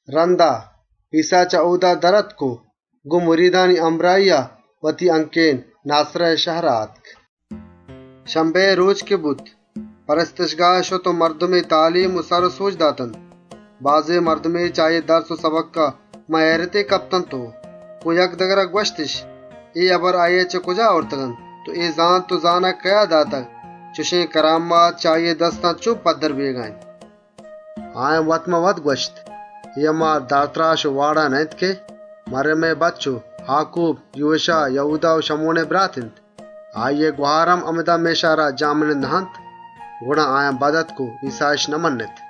‏ رندا، ایسّا چه اۆدا در آتک و گۆن مریدانی همراهیا وتی جندئے شهرا آتک. ‏ شَبَّتئے رۆچ که بوت، کنیسها شت و مردمی تالیم و سر و سۆج داتنت. بازێن مردمے چه آییئے درس و سَبکان مان هئیرتے کپت و گۆن یکدگرا گوَشتِش: «اے هبر آییا چه کجا آورتگ‌اَنت و اے زانت و زانگ کئیا داتگ؟ اے ڈئولێن اَجَبێن کارانی کنگئے واک و توانی چه کجا دستا کپتگ؟» ‏ آیان وت‌مان‌وتا گوَشت: «اے هما دارتراش نه‌اِنت که مَریمئے بَچّ و آکوب، یوشا، یَهودا و شَمونئے برات اِنت؟ آییئے گهار هم همِدا مئے شهرا جهمنند نه‌اَنت؟» گڑا آیان بد آتک و ایسّااِش نمَنِّت. ‏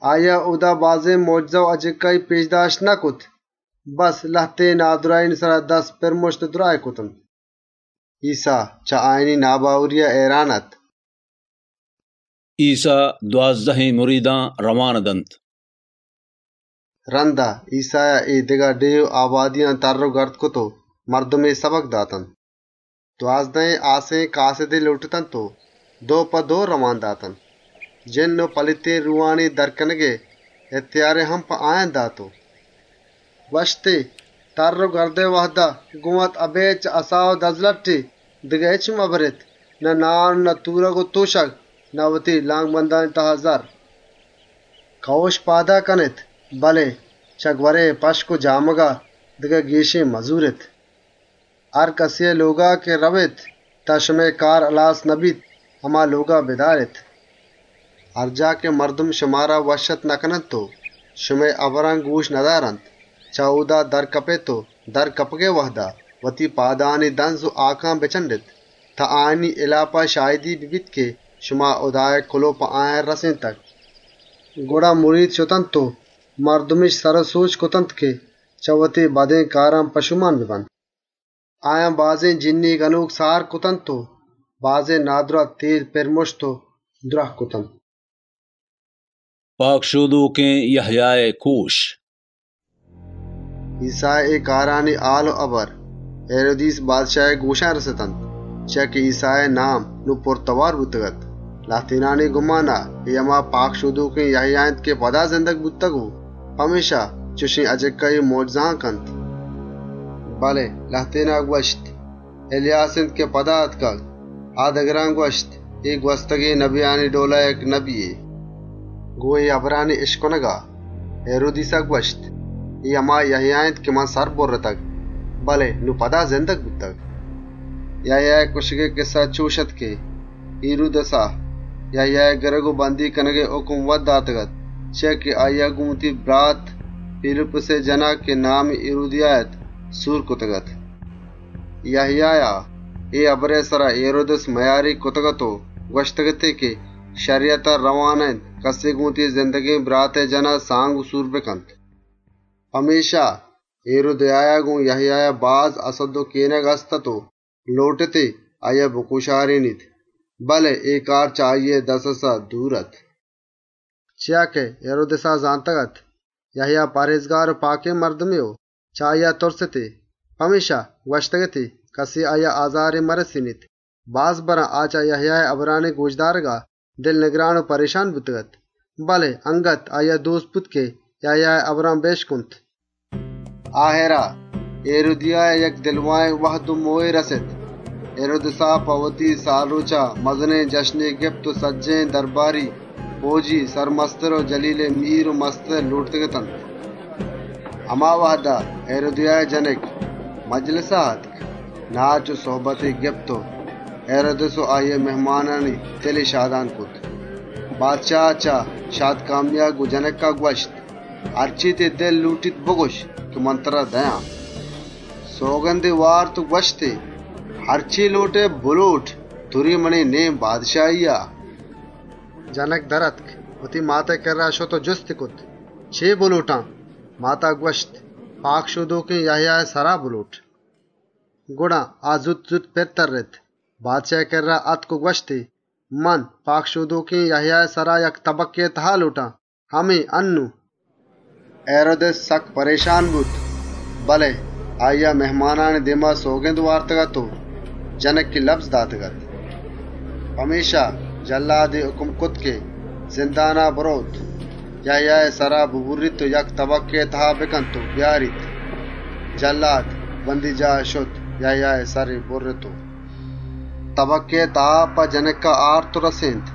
آییا اۆدا بازێن مۆجزه پێش داشت نکرت، بَسّ لهتێن نادْراهانی سرا دستی پِر مُشت و دْراهی کرتنت. ‏ ایسّا، چه آیانی ناباوریا هئیران اَت. ایسّا دوازدهێن کاسِدان رئوانَ دنت رَندا، ایسّایا اے دگه مێتگ و آبادیان ترّ و گردَ کرت و مردمی سَبکَ داتنت. ‏ دوازدهێن کاسِدی لۆٹتنت و دو په دو رئوان کرتنت، جِنّ و پلیتێن روهانی در کنگئے واک و اِهتیاری هم داتنت و ‏ گوَشتی: «تَرّ و گردئے وهدا، گۆن وت اَبێد چه اَسا و دَزلَٹّے دگه هچّ مبرێت، نه نان و نه تورگ و تۆشگ، نه وتی لانکبندانی تها زَرّ. ‏ کئوش پادا کنێت، بله چه گوَرئے جامگا ابێد، دگه گێشێن مزورێت. ‏ هرکَسێئے لۆگا که رئوێت، تان شمئے کار هلاسَ نبیت، هما لۆگا بدارێت. ‏ هر جاه که مردم شمارا وشّ‌آتکَ نکننت و شمئے هبران گۆشَ ندارنت، چه اۆدا در کپێت و در کپگئے وهدا، وتی پادانی دَنز و هاکان بچَنڈێت، تان آیانی هِلاپا شاهدی ببیت که شما هُدائے کُلئو په آیان رسێنتگ.» ‏ گڑا، مرید شتنت و مردمِش سر و سۆج کرتنت که چه وتی بدێن کاران پشۆمان ببنت. ‏ آیان بازێن جِنّی گنۆک سار کرتنت و بازێن نادْراه، ٹێل پِر مُشت و دْراه کرتنت. پاکشۆدۆکێن یَهیائے کُشگ ‏ ایسّائے اے کارانی هال و هبر هیرودیس بادشاهئے گۆشا رَستنت چیا که ایسّائے نام، نون پُرتئوار بوتگ‌اَت. لهتێنئے گُمان اَت، اے هما پاکشۆدۆکێن یَهیا اِنت که پدا چه مُردگان زندگ بوتگ، پمێشکا چُشێن اَجِکّایی و مۆجزهانَ کنت. ‏ بله لهتێنا گوَشت: «اِلیاس نبی اِنت که پدا آتکگ،» آ دگرانَ گوَشت: «اے، گوَستگێن پئیگمبرانی ڈئولا، یک پئیگمبرے.» ‏ گۆن اے هبرانی اِشکنگا، هیرودیسا گوَشت: «اے هما یَهیا اِنت که من سر بُرِّتگ، بله نون پدا زندگ بوتگ.» ‏ یَهیائے کُشگئے کِسّه چُش اَت که هیرودیسا، یَهیائے گِرگ و بَندی کنگئے هُکم وت داتگ‌اَت، چیا که هیرودیسا گۆن وتی برات، پیلیپُسئے جَنا، که نامی هیرودیا اَت، سور کرتگ‌اَت. ‏ یَهیایا اے هبرئے سرا هیرودیس مئیاریگ کرتگ‌اَت و گوَشتگ‌اَتی که شَریَتا رئوا نه‌اِنت کَسے گۆن وتی زندگێن براتئے جَنا سانگ و سور بکنت. ‏ پمێشکا، هیرودیایا گۆن یَهیایا باز هَسَدّ و کێنگ هست‌اَت و لۆٹتی آییا بکۆشارێنیت، بله اے کار چه آییئے دَزرسا دور اَت، ‏ چیا که هیرودیسا زانتگ‌اَت یَهیا پهرێزکار و پاکێن مردمے و چه آییا تُرستی. پمێشکا گوَشتگ‌اَتی کَسے آییا آزارے مرسێنیت. باز برا، آ چه یَهیائے هبرانی گۆش دارگا نگران و پرێشان بوتگ‌اَت بله اَنگت آییا دۆستَ بوت که یَهیائے هبران بِشکنت. ‏ آهِرا، هیرودیایا گوَم و گێگێن وهد و مۆهے رَست. هیرودیسا په وتی سالگِرَها، مزنێن جشنے گپت و سجّهێن درباری، پئوجی سرمستر و جَلیلئے میر و مستر لۆٹتگ‌اتنت. ‏ هما وهدا، هیرودیائے جنک مجلسا آتک، ناچ و سُهبتی گپت و هیرودیس و آییئے مهمانی وَشدل کرتنت. بادشاها چه گَلا گۆن جنکا گوَشت: «هرچے تئیی دلَ لۆٹیت بگوَش، که من ترا دئیان.» ‏ سئوگندی وارت و گوَشتی: «هرچے لۆٹئے، بلۆٹ، تُرے منی بادشاهیئے نێما.» ‏ جنک در آتک، وتی ماتئے کِرّا شت و جُستی کرت: «چے بلۆٹان؟» ماتا گوَشت: «پاکشۆدۆکێن یَهیائے سرا بلۆٹ.» ‏ گڑا آ زوت زوت پِر ترّت، بادشاهئے کِرّا آتک و گوَشتی: «من پاکشۆدۆکێن یَهیائے سرا تَبَکێئے تها لۆٹان، همے انّون.» ‏ هیرودیس بادشاه سکّ پرێشان بوت، بله آییا مهمانانی دێما سئوگند وارتگ‌اَت و جنکی لَبز داتگ‌اَت. ‏ پمێشکا جلّادی هُکم کرت که زندانا برئوت، یَهیائے سرا ببُرّیت و یک تَبَکێئے تها بکنت و بیاریت. جلّاد، بَندیجاها شت، یَهیائے سَری بُرِّت و ‏ تَبَکێئے تها په جنکا آورت و رَسێنت.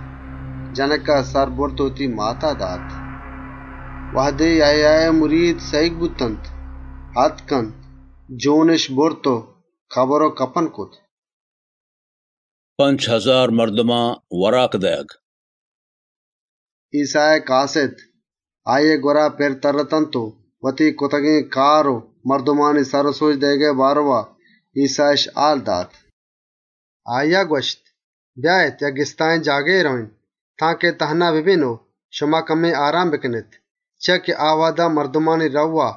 جنکا سر برت و وتی ماتارا دات. ‏ وهدے یَهیائے مرید سَهیگ بوتنت، آتکنت، جۆنِش برت و کَبر کرت. پنچ هزار مردما وراک دئیگ ‏ ایسّائے کاسِد، آییئے گوَرا پِر ترّتنت و وتی سجّهێن کرتگێن کار و مردمانی سر و سۆج دئیگئے بارئوا ایسّااِش هال دات. ‏ آییا گوَشت: «بیاێت یک گِستاهێن جاگهے رئوێن تانکه تهنا ببێن و شما کمّے آرام بکنێت.» چیا که آ وهدا مردمانی رئو و آ،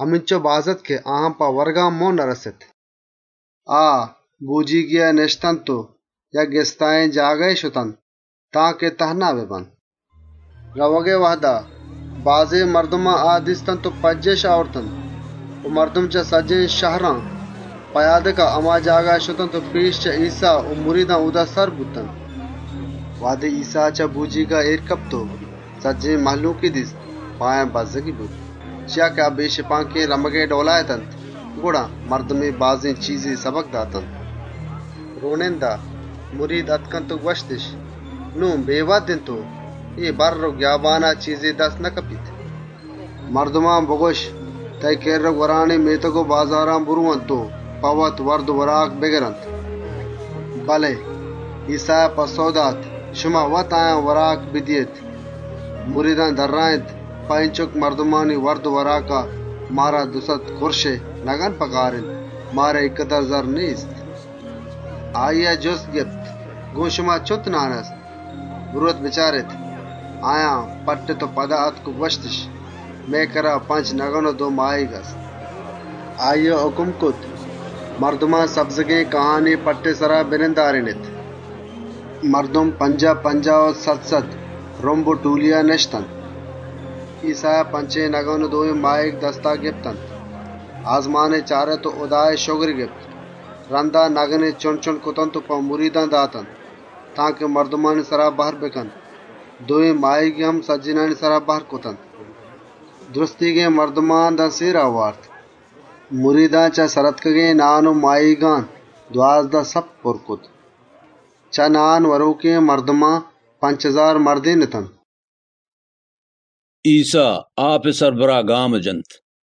همینچُک باز اَت که آیان په ورگا هم مۆهَ نرَست. ‏ آ، بۆجیگێا نِشتنت و یک گِستاهێن جاگهے شتنت تانکه تهنا ببنت. ‏ رئوگئے وهدا، بازێن مردمێا آ دیستنت و پَجّاهِش آورتنت و مردم چه سجّهێن شهران پئیادکا هما جاگها شتنت و چه ایسّا و مریدان پێسر اۆدا سر بوتنت. ‏ وهدے ایسّا چه بۆجیگا اێر کپت و مردمانی مزنێن مُچّی‌ای دیست، آیانی سرا بَزّگی بوت، چیا که آ بێشپانکێن پَسانی ڈئولا اتنت. گڑا مردمی بازێن چیزے سَبک داتنت. ‏ رۆنِندا، مرید آتکنت و گوَشتِش: «نون بێوهد اِنت و اے گِستاهێن جاگها چیزے دستَ نکپیت. ‏ مردمان بگوَش تان اے کِرّ و گوَرانی مێتگ و بازاران برئونت و په وت وَرد و وراک بگرنت.» ‏ بله ایسّایا گوَشت: «شما وت آیان وراک بدئیێت». مریدان درّاێنت: «په اینچک مردمانی وَرد و وراکا، مارا دوسَد دینارئے نگن پکار اِنت. مارا اینکدر زرّ نێست.» ‏ آییا جُست گپت: «گۆن شما چُنت نان هست؟ برئوێت بچارێت.» آیان پَٹِّت و پدا آتک و گوَشتِش: «مئے کِرّا پنچ نگن و دو ماهیگ هست.» ‏ آییا هُکم کرت: «مردمان سبزگێن کاهانی پَٹّئے سرا بنندارێنێت.» ‏ مردم پنجاه پنجاه و سَد سَدئے رُمب و ٹۆلیا نِشتنت. ‏ ایسّایا پنچێن نگن و دوێن ماهیگ دستا کرتنت، آسمانی چارت و هُدائے شگری گپت. رَندا نگنی چُنڈ چُنڈ کرتنت و مریدانی دستا داتنتی تانکه مردمانی سرا بهر بکننت. دوێن ماهیگی هم سجّهێنانی سرا بهر کرتنت. ‏ سجّهێن مردمان تان سێرا وارت. ‏ مریدان چه سر آتکگێن نان و ماهیگان دوازده سَپْت پُرّ کرت. ‏ چه نان وَرۆکێن مردمان، پنچ هزار مردێن اتنت. ایسّا آپئے سَربُرا گامَ جنت ‏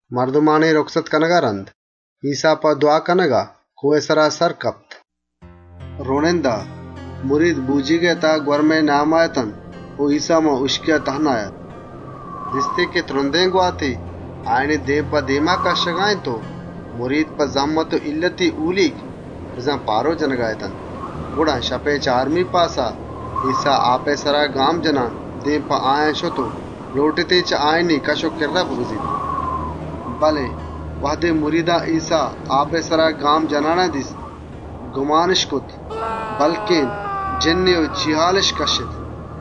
مردمانی یله کنگا رَند، ایسّا په دْوا کنگا کۆهئے سرا سر کپت. ‏ رۆنِندا، مرید بۆجیگئے تها گوَرمئے نیاما اتنت و ایسّا هُشکیا تهنا اَت. ‏ دیستی که ترندێن گواتے آیانی دێم په دێما کَشّگا اِنت و مرید په زهمت و هیلّتے هولیگ جنَگا اَنت. گڑا شپئے چارمی پاسا، ایسّا آپئے سرا گام جنان، دێم په آیان آتک و لۆٹتی چه آیانی کَش و کِرّا بگوَزیت. ‏ بله وهدے آیان ایسّا آپئے سرا گام جنان دیست، گُمانِش کرت بلکێن روهے و جاک و سلواتِش کرت. ‏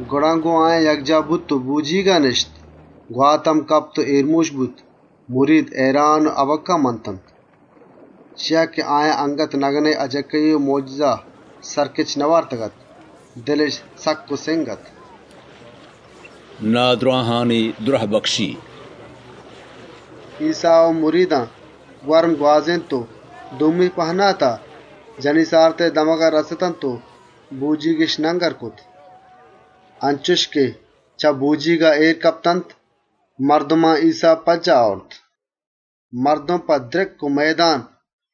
گڑا گۆن آیان یکجاه بوت و بۆجیگا نِشت، گوات هم کپت و آرام بوت. مرید هئیران و هَبَکَّه منتنت، ‏ چیا که آیان اَنگت نگنئے مۆجزه سَرکِچ نئوارتگ‌اَت، دلِش سکّ و سِنگ اَت. نادْراهانی دْرهبکشی ‏ ایسّا و مریدان گوَرم گوازێنت و دومی پهناتا گِنیسارِتئے شهرا رَستنت و بۆجیگِش نَنگر کرت. ‏ انچُش که چه بۆجیگا اێر کپتنت، مردمان ایسّا پَجّاه آورت. ‏ مردم په دْرِکّ و مئیدان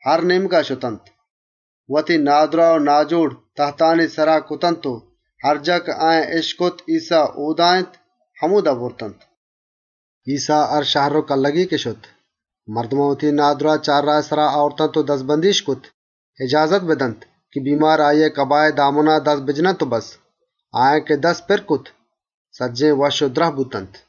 هر نێمگا شتنت، وتی نادْراه و ناجۆڑ تَهتانی سرا کرتنت و هر جاه که آیان اِشکت ایسّا اۆدا اِنت، همۆدا برتنت. ‏ ایسّا هر شهر و کلّگے که شت، مردمان وتی نادْراه چارراهانی سرا آورتنت و دَزبندی‌اِشَ کرت اجازت بدنت که بیمار آییئے کباهئے لَمبا دست بجننت. آیان که دست پِرَ کرت، سجّهێن وشّ و دْراهَ بوتنت.